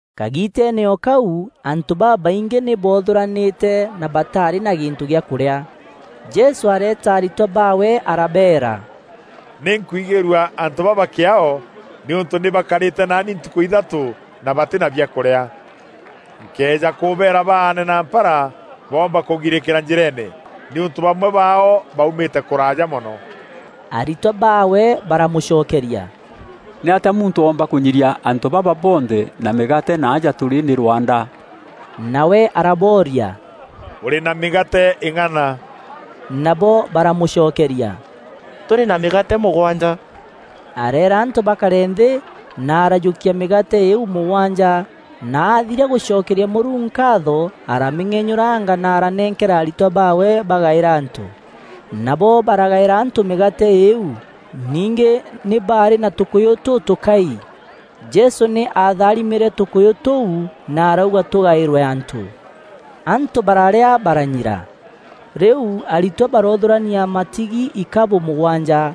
Kagiiteene o kau, antû babaingî nî boothûranîte na bataarî na gîntû giakûrîa. Jesû areeta aritwa baawe arabeera, “Nî nkwigîîrua antû baba kîaao nîûntû nî bakarîte naani ntukû ithatû na batî na biakûrîa. Nkëeja kûbeera baane na mpara boomba kûgirîkîra njîreene, nîûntû bamwe baao baaumîte kûraaja mono.” Aritwa baawe baramûcokeria, “Nîatîa muntû oomba kûnyiria antû baba bonthe na mîgaate na aja tûrî nî rwanda?” Nawe arabooria, “Bûrî na mîgaate îng'ana?” Nabo baramûcokeria, “Tûrî na mîgaate mûgwanja.” Areera antû bakare nthî na arajûkia mîgaate îîu mûgwanja, na aathiria gûcokeria Mûrungu nkaatho aramîng'enyûranga na aranenkera aritwa baawe bagaîra antû. Nabo baragaîra antû mîgaate îîu. Ningî nî baarî na tûkûyû tûtûkai. Jesû nî aatharimîre tûkûyû tûu na arauga tûgaîrwe antû. Antû bararîa baranyira. Rîu aritwa baroothûrania matigi ikabû mûgwanja.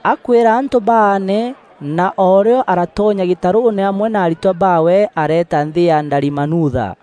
Akwîra antû baane, na o rîo aratonya gîtarûûne amwe na aritwa baawe, areeta nthî ya Dalimanutha.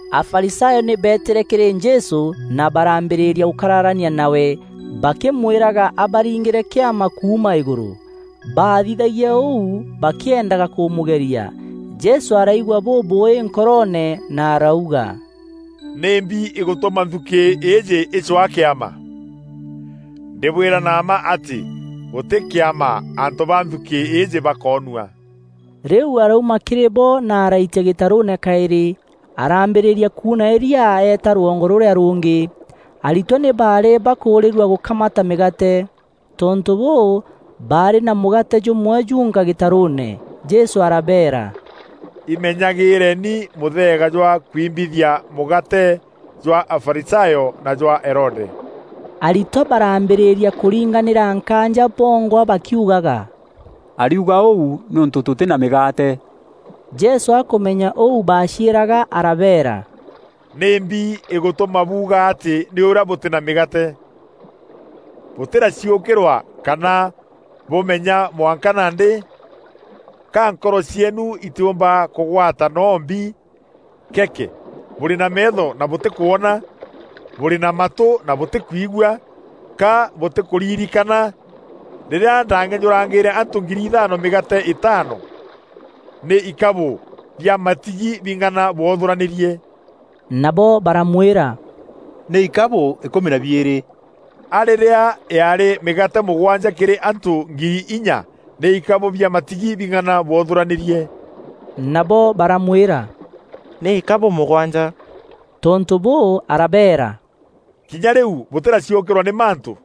Afarisayo nî beetîre kîrî Jesû na baraambîrîria gûkararania nawe bakîmwîraga abaringîre kîama kuuma îgûrû. Baathithagia ûu bakîendaga kûmûgeria. Jesû araigua bûbûûî nkoroone, na arauga, “Nîmbi îgûtûma nthukî îîjî îcwaa kîama? Ndîbwîra na mma atî gûtî kîama antû ba nthukî îîjî bakoonua.” Rîu arauma kîrî bo na araitia gîtarûûne kaîrî, araambîrîria kuuna îria eeta rwongo rûrîa rûngî. Aritwa nî baarî bakûûrîîrua gûkamata mîgaate. Tontû bûû, baarî na mûgaate jûmwe junka gîtarûûne. Jesû arabeera, “Imenyagîreeni mûtheega jwa kwimbithia mûgaate jwa Afarisayo na jwa Herode.” Aritwa baraambîrîria kûringanîra nkaanja bongwa bakiugaga, “Ariuga ûu nîûntû tûtî na mîgaate.” Jesû akûmenya ûu baaciîraga arabeera, “Nîmbi îgûtûma buuga atî nî ûrîa bûtî na mîgaate? Bûtîraciûkîrwa kana bûmenya mwanka nandî? Ka nkoro cieenu itîûmba kûgwata noo mbi? Keeke! Bûrî na meetho na bûtîkwona? Bûrî na matû na bûtîkwigua? Ka bûtîkûririkana rîrîa ndaang'enyûrangîîre antû ngiri ithaano mîgaate îtaano? Nî ikabû bia matigi bing'ana bwothûranîrie?” Nabo baramwîra, “Nî ikabû îkûmi na biîrî.” “A rîrîa yaarî mîgaate mûgwanja kîrî antû ngiri inya, nî ikabû bia matigi bing'ana bwothûranîrie?” Nabo baramwîra, “Nî ikabû mûgwanja.” Tontû bûû arabeera, “Kinya rîu bûtîraciûkîrwa nî mantû?”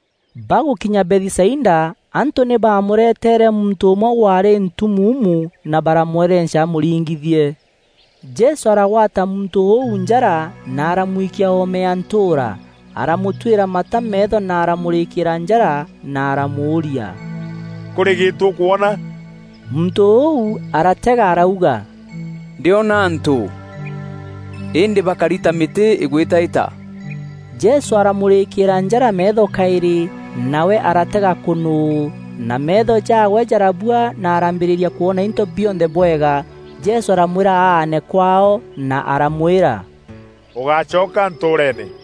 Bagûkinya Bethisaida, antû nî baamûreteere muntû ûmwe waarî ntumuumu na baramwerenca amûringithie. Jesû aragwata muntû ûu njara na aramwikia oome ya ntûûra. Aramûtwîra mata meetho na aramûrîkîîra njara na aramûûria, “Kûrî gîntû ûkwona?” Muntû ûu aratega arauga, “Ndîona antû, îndî bakari ta mîtî îgwîtaîta.” Jesû aramûrîkîîra njara meetho kaîrî, nawe aratega kûnûû, na meetho jaawe jarabua na araambîrîria kwona into bionthe bwega. Jesû aramwîra aane kwaao na aramwîra, “Ûgácoka ntûûreene!”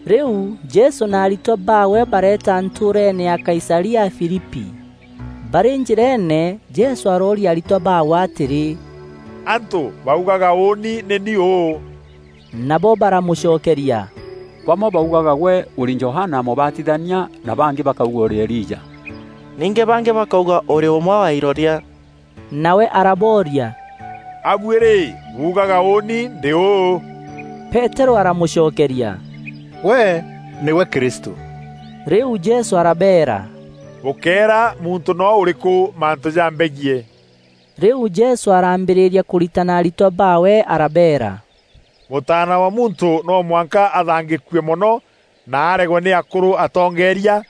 Rîu Jesû na aritwa baawe bareeta ntûûreeene ya Kaisaria Filipi. Barî njîreene, Jesû arooria aritwa baawe atîrî, “Antû baugaga ûûni nî ni ûû?” Nabo baramûcokeria, “Bamwe baugaga gwe ûrî Johana Mûbatithania, na bangî bakauga ûrî Elija, ningî bangî bakauga ûrî ûmwe wa iroria.” Nawe arabooria, “A buî rî, buugaga ûûni ndî ûû?” Peterû aramûcokeria, “Gwe nîgwe Kristû.” Rîu Jesû arabeera, “Bûkéera muntû noo ûrîkû mantû jambegiî.” Rîu Jesû araambîrîria kûritana aritwa baawe arabeera, “Mûtaana wa Muntû no mwanka athangîkue mono na aregwe nî akûrû atongeeria,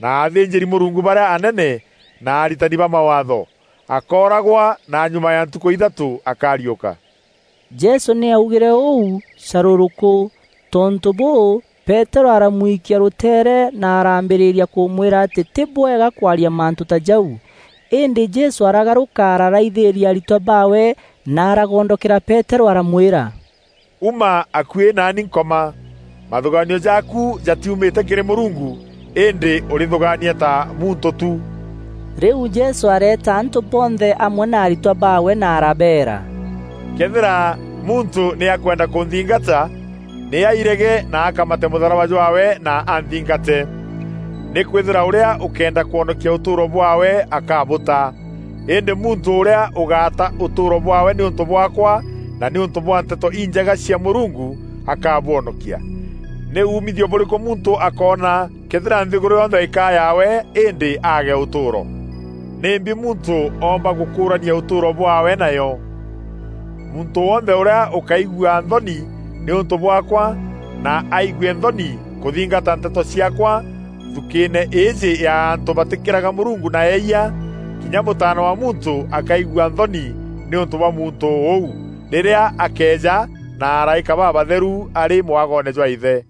na athînjîri-Mûrungu barîa anene, na aritani ba Mawaatho. Akooragwa, na nyuma ya ntukû ithatû akariûka.” Jesû nî aaugîre ûu carûrûkû. Tontû bûû, Peterû aramwikia rûteere na araambîrîria kûmwîra atî tî bûbwega kwaria mantû ta jau. Îndî Jesû aragarûka araraithîîria aritwa baawe na aragondokera Peterû aramwîra, “Uma akuî naani Nkoma! Mathûgaanio jaaku jatiumîte kîrî Mûrungu îndî ûrîthûgaania ta muntû tu.” Rîu Jesû areeta antû bonthe amwe na aritwa baawe na arabeera, “Këethîra muntû nî akwenda kûnthingata, nî airege na akamate mûtharaba jwaawe na anthingate. Nîkwîthîrwa ûrîa ûkenda kwonokia ûtûûro bwaawe akabûta. Îndî muntû ûrîa ûgata ûtûûro bwaawe nîûntû bwaakwa na nîûntû bwa Nteto Injega cia Mûrungu, akabwonokia. “Nî umithio bûrîkû muntû akoona, këethîra nthîgûrû yonthe îkaa yaawe îndî aage ûtûûro? Nîmbi muntû oomba gûkûrania ûtûûro bwaawe nayo? Muntû wonthe ûrîa ûkaigua nthoni nîûntû bwaakwa na aigue nthoni kûthingata nteto ciaakwa, nthukîîne îîjî ya antû batîkîraga Mûrungu na eeyia, kinya Mûtaana wa Muntû akaigua nthoni nîûntû bwa muntû ûu, rîrîa akeeja na araîka babatheru arî mwagoone jwa Îthe.”